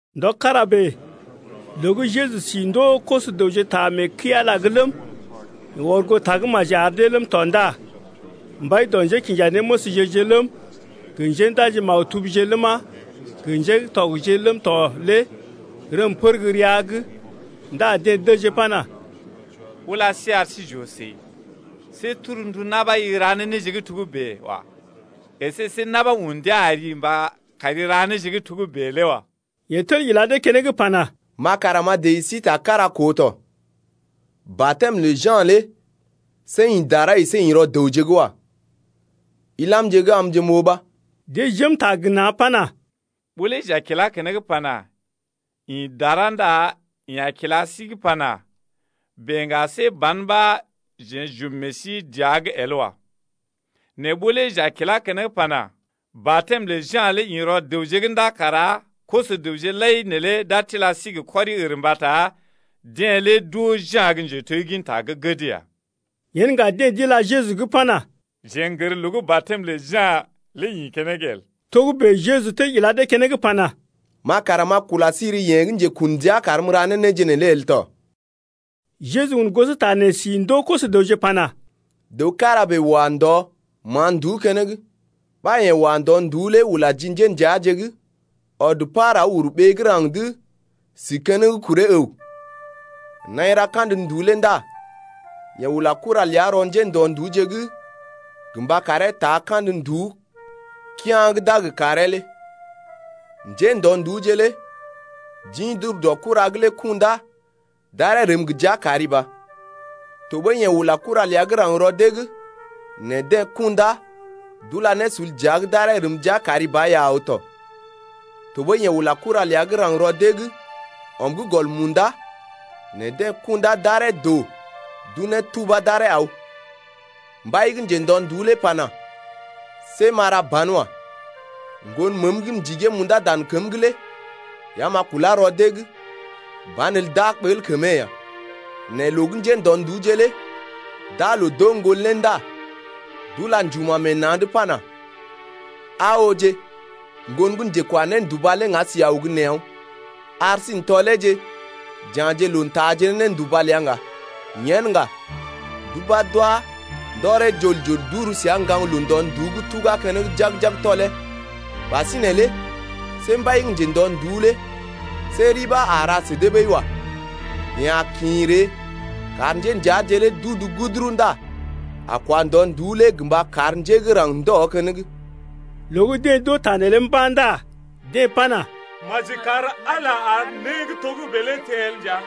Ndɔ kára bèe loo gə́ Jeju si ndoo koso-dəwje ta mee kəi-Ala’g ləm, yeḛ ɔr goo tagə́maji ar dee ləm tɔ ndá mbai dɔ njékinjanéməsje-je ləm, gə njéndaji-maktubje ləma, gə ŋgatɔgje ləm tɔ lé rəm pər gə́ rəa’g ndá deḛ dəjee pana: Ula sí ar sí j’oo səi, see torndu na̰ ɓa i ra ne néje gə́ togə́bè wa. Esé see na̰ ɓa un ndia ari gə mba kari ra ne néje gə́ togə́bè lé wa. Yeḛ tel ila dee keneŋ pana: Ma kara m’a dəji sí ta kára koo tɔ. Batɛm lə Ja̰ lé see ḭ dara əsé ḭ rɔ dəwje’g wa. Ilamje’g amje m’oo ɓa. Deḛ jém ta gə na̰ pana: Ɓó lé j’a kilá keneŋ pana: Ḭ dara ndá yeḛ a kila sí’g pana: Bèe ŋga see ban ɓa jeḛ j’ɔm meḛ sí dəa’g el wa. Nɛ ɓó lé j’a kilá keneŋ pana: Batɛm lə Ja̰ lé ḭ rɔ dəwje’g ndá kara koso-dəwje lai neelé d’a tila sí gə kɔri-ər mbata deḛ lé d’oo Ja̰ gə́ njetegginta gə́ gəd ya. Yen ŋga deḛ d’ila Jeju’g pana: Jeḛ n’gər loo gə́ batɛm lə Ja̰ lé ḭ keneŋ el. Togə́bè Jeju tel ila dee keneŋ pana: Ma kara m’a kula sí ri yeḛ gə́ njekun ndia karm m’ra ne néje neelé el tɔ. Jeju un gosota nee si ndoo koso-dəwje pana: Dəw kára bèe wa ndɔ ma̰a nduú keneŋ, ɓa yeḛ wa ndɔ-nduú lé ula ji njéndəaje’g, ɔd par aw uru ɓee gə́ raŋg’d si keneŋ kuree əw. Naḭ ra kandə nduú lé ndá yeḛ ula kura ləa rɔ njéndɔ-nduúje’g gə mba karee taa kandə nduú kea̰ gə́ d’a gə karee lé. Njéndɔ-nduúje lé d’ḭ d’ur dɔ kura’g lé kundá d’aree rəm gə jia kari ba. Tɔɓəi yeḛ ula kura ləa gə́ raŋg rɔ dee’g, nɛ deḛ kundá d’ula ne sul dəa’g d’aree rəm jia kari ba ya aw tɔ. Tɔɓəi yeḛ ula kura ləa gə́ raŋg rɔ dee’g ɔm gə́ gɔl munda, nɛ deḛ kundá d’aree doo d’unee tubá d’aree aw. Mbai gə́ njendɔ-nduú lé pana: See m’a ra banwa. Ŋgon məəm gə́ m’ndigee m’undá dan kəm’g lé ya m’a kulá rɔ dee’g, banelə d’a ɓəl kəmee ya. Nɛ loo gə́ njéndɔ-nduúje lé d’aa loo d’oo ŋgon lé ndá d’ula njuma̰ meḛ na̰’d pana: Aa ooje, ŋgon gə́ njekwa-nénduba lé ŋga si aw gə́ nee aw’n. Ar sí n’tɔleeje j’ya̰je loo n’taaje ne nénduba ləa ŋga. Yen ŋga d’ubá d’wá ndɔree jol-jol d’uru səa ŋgaŋloo ndɔ-nduú’g tugá keneŋ jag-jag tɔlee. Ɓasinè lé see mbai gə́ njendɔ-nduú lé see ri ɓa a ra sə dee ɓəi wa. Yeḛ a kḭ ree kar njéndəaje lé d’udu guduru ndá a kwa ndɔ-nduú lé gə mba kar njé gə́ raŋg ndɔ keneŋ. Loo gə́ deḛ d’oo ta neelé mba̰ ndá deḛ pana: Maji kar Ala ar né gə́ togə́bè lé teḛ el nja.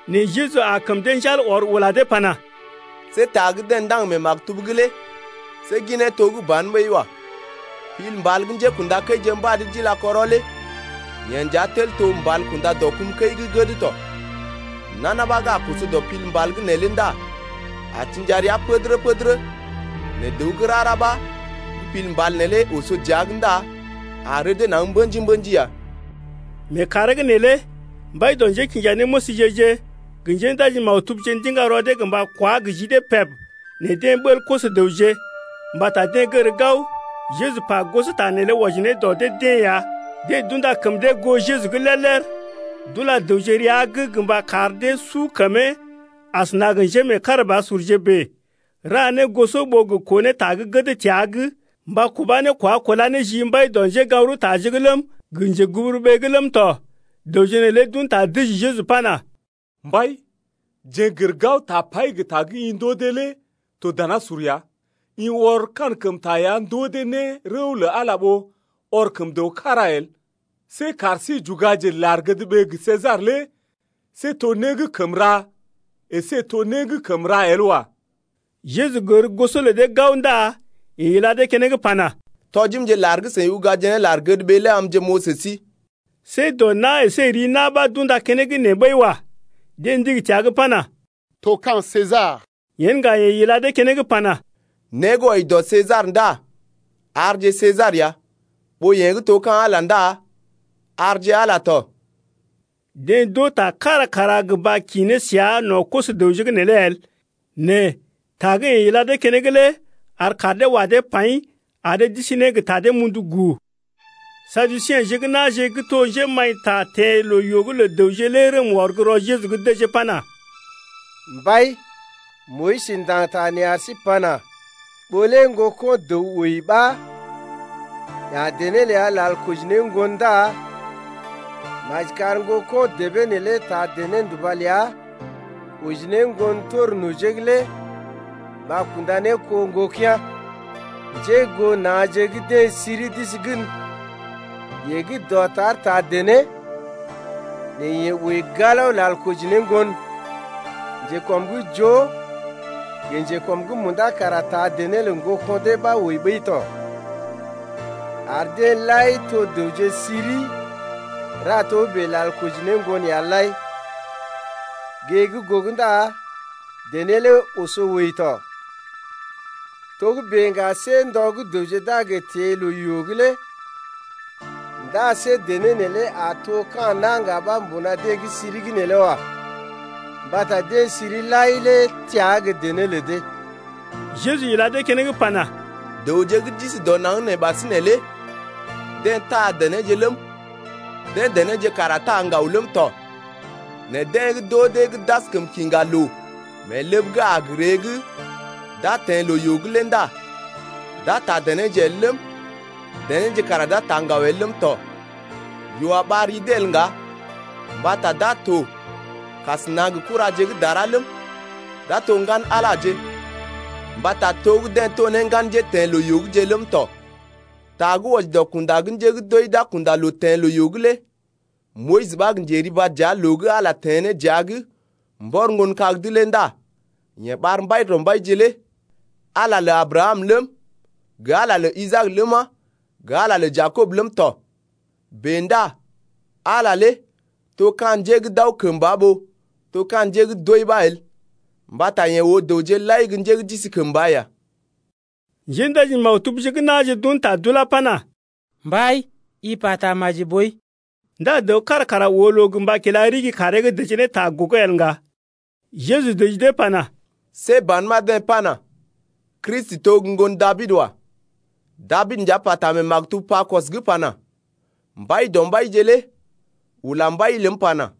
Nɛ Jeju aa kəm dee njal ɔr ula dee pana: See ta gə́ deḛ ndaŋg mee maktub’g lé see ginee to gə́ ban ɓəi wa. Pil mbal gə́ njékṵdakəije mbad d’ila kɔrɔ lé Yee nja tel to mbal kunda dɔ kum kəi gə́ gəd tɔ. Nana ɓa gə́ a koso dɔ pil mbal’g neelé ndá a təd njigi-njigi, nɛ dəw gə́ rara ɓa gə́ pil mbal neelé oso dəa’g ndá a rədee naŋg mbə̰ji-mbə̰ji ya. Mee kàree’g neelé mbai dɔ njékinjanéməsje-je gə njéndaji-maktubje ndiŋga rɔ dee gə mba kwá gə ji dee peb nɛ deḛ ɓəl koso-dəwje. Mbata deḛ gər gao, Jeju pa gosota neelé wɔji ne dɔ dee-deḛ ya. Deḛ d’unda kəm dee goo Jeju’g lér-lér, d’ula dəwje rəa’g gə mba kar dee su kəmee asəna gə njémeekarabasurje bèe, ra ne goso ɓó gə koo ne ta gə́ gəd təa’g mba kubá ne kwá kulá ne ji mbai dɔ njégaŋ-rəwtaje’g ləm, gə njeguburuɓee’g ləm tɔ. Dəwje neelé d’un ta dəji Jeju pana: Mbai, jeḛ n’gər gao tapai gə ta gə́ i ndoo dee lé to danasur ya, i ɔr kankəmta ya ndoo dee ne rəw lə Ala ɓó ɔr kəm dəw kára el. See kar sí j’ugaje lar-gədɓee gə Sesar lé see to né gə́ kəm ra əsé to né gə́ kəm ra el wa. Jeju gər goso lə dee gao ndá yeḛ ila dee keneŋ pana: Tɔjimje lar gə́ seḭ ugaje ne lar-gədɓee lé amje m’oo sə sí. See dɔ na̰ əsé ri na̰ ɓa d’unda keneŋ nee ɓəi wa. Deḛ ndigi təa’g pana: To ka̰ Sesar. Yen ŋga yeḛ ila dee keneŋ pana: Né gə́ wɔji dɔ Sesar ndá arje Sesar ya, ɓó yee gə́ to ka̰ Ala ndá arje Ala tɔ. Deḛ d’oo ta kára kara gə mba kḭ ne səa no̰ koso-dəwje’g neelé el, nɛ ta gə́ yeḛ ila dee keneŋ lé ar kaar dee wa dee paḭ ar dee d’isi ne gə ta dee mundu guu. Saduseḛje gə́ na̰je gə́ to njémaḭta teḛ loo-yoo’g lə dəwje lé rəm wɔr gə́ rɔ Jeju’g dəjee pana: Mbai, Moyis ndaŋg ta nee ar sí pana: Ɓó lé ŋgoko̰ dəw wəi ɓa ya̰ dené ləa lal koji ne ŋgon ndá maji kar ŋgoko̰ debee neelé taa dené-nduba ləa oji ne ŋgon tor nojee’g lé mba kunda ne kó ŋgokea̰. Njé goo na̰je’g deḛ siri d’isi gən. Yeḛ gə́ dɔtar taa dené, nɛ yeḛ wəi galao lal koji ne ŋgon. Njekɔm gə́ joo gə njekɔm’g munda kara taa dené lə ŋgoko̰ dee ɓa d’wəi ɓəi tɔ. Ar deḛ lai to dəwje siri ra togə́bè lal koji ne ŋgon ya lai. Gée gə́ gogo ndá dené lé oso wəi tɔ. Togə́bè ŋga see ndɔ gə́ dəwje d’a gə teḛ loo-yoo’g lé ndá see dené neelé a to ka̰ na̰ ŋga ɓa mbuna deḛ gə́ siri’g neelé wa. Mbata deḛ siri lai lé təa gə́ dené lə dee ya. Jeju ila dee keneŋ pana: Dəwje gə́ d’isi dɔ naŋg nee ɓasinè lé deḛ taa denéje ləm, deḛ denéje kara taa ŋgaw ləm tɔ, nɛ deḛ gə́ d’oo dee gə́ d’askəm kiŋga loo mee ləb gə́ a gə ree gə́ d’a teḛ loo-yoo’g lé ndá d’a taa denéje el ləm, denéje kara d’a taa ŋgaw el ləm tɔ. Yoo a ɓar ri dee el ŋga mbata d’a to kasəna gə kuraje gə́ dara ləm, d’a to ŋgan-Alaje mbata to gə́ deḛ to ne ŋgan njéteḛ loo-yoo’gje ləm tɔ. Ta gə́ wɔji dɔ kunda gə́ njé gə́ d’wəi d’a kunda loo teḛ loo-yoo’g lé Moyis ɓa gə́ njeriba dəa loo gə́ Ala teḛ ne dəa’g mbɔr ŋgon kag’d lé ndá yeḛ ɓar Mbaidɔmbaije lé Ala lə Abrakam ləm, gə Ala lə Isaak ləma, gə Ala lə Jakob ləm tɔ. Bèe ndá Ala lé to ka̰ njé gə́ d’aw kəmba ɓó to ka̰ njé gə́ d’wəi ɓa el, mbata yeḛ oo dəwje lai gə́ njé gə́ d’isi kəmba ya. Njéndaji-maktubje gə́ na̰je d’un ta d’ulá pana: Mbai, i pata maji boi. Ndá dəw kára kara oo loo gə mba kila ɗigi kaaree’g dəjee ne ta gogo el ŋga. Jeju dəji dee pana: See ban ɓa deḛ pana: Kristi to gə́ ŋgon Dabid wa. Dabid nja pata mee maktub Pakɔs’g pana: Mbaidɔmbaije lé ula Mbai ləm pana: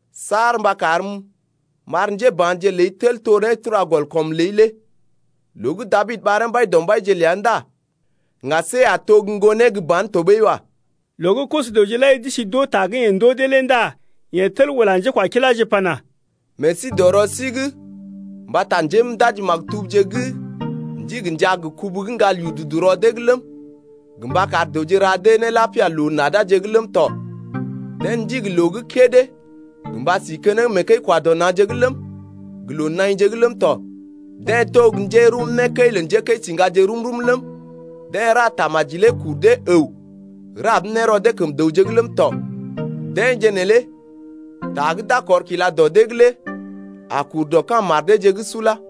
Saar mba karm m’ar njéba̰je ləi Tel to nétura-gɔl-kɔm ləi lé. Loo gə́ Dabid ɓaree Mbaidɔmbaije ləa ndá ŋga see a to gə́ ŋgonee gə́ ban tɔɓəi wa. Loo gə́ koso-dəwje lai d’isi d’oo ta gə́ yeḛ ndoo dee lé ndá yeḛ tel ula njékwakiláje pana: Meḛ sí dɔ rɔ sí’g mbata njéndaji-maktubje gə́ ndigi njaa gə kubu gə́ ŋgal yududu rɔ dee’g ləm, gə mba kar dəwje ra dee ne lapia loo-nadaje’g ləm tɔ, deḛ ndigi loo gə́ kédé gə mba si keneŋ mee kəi-kwa-dɔ-na̰’gje ləm, gə loo naḭje’g ləm tɔ, deḛ to gə́ njerum né kəi lə njékəisiŋgaje rum-rum ləm, deḛ ra tamaji lé kur dee əw rab ne rɔ dee kəm dəwje’g ləm tɔ. Deḛje neelé ta gə́ d’a kɔr kila dɔ dee’g lé a kur dɔ ka̰ mar deeje’g sula.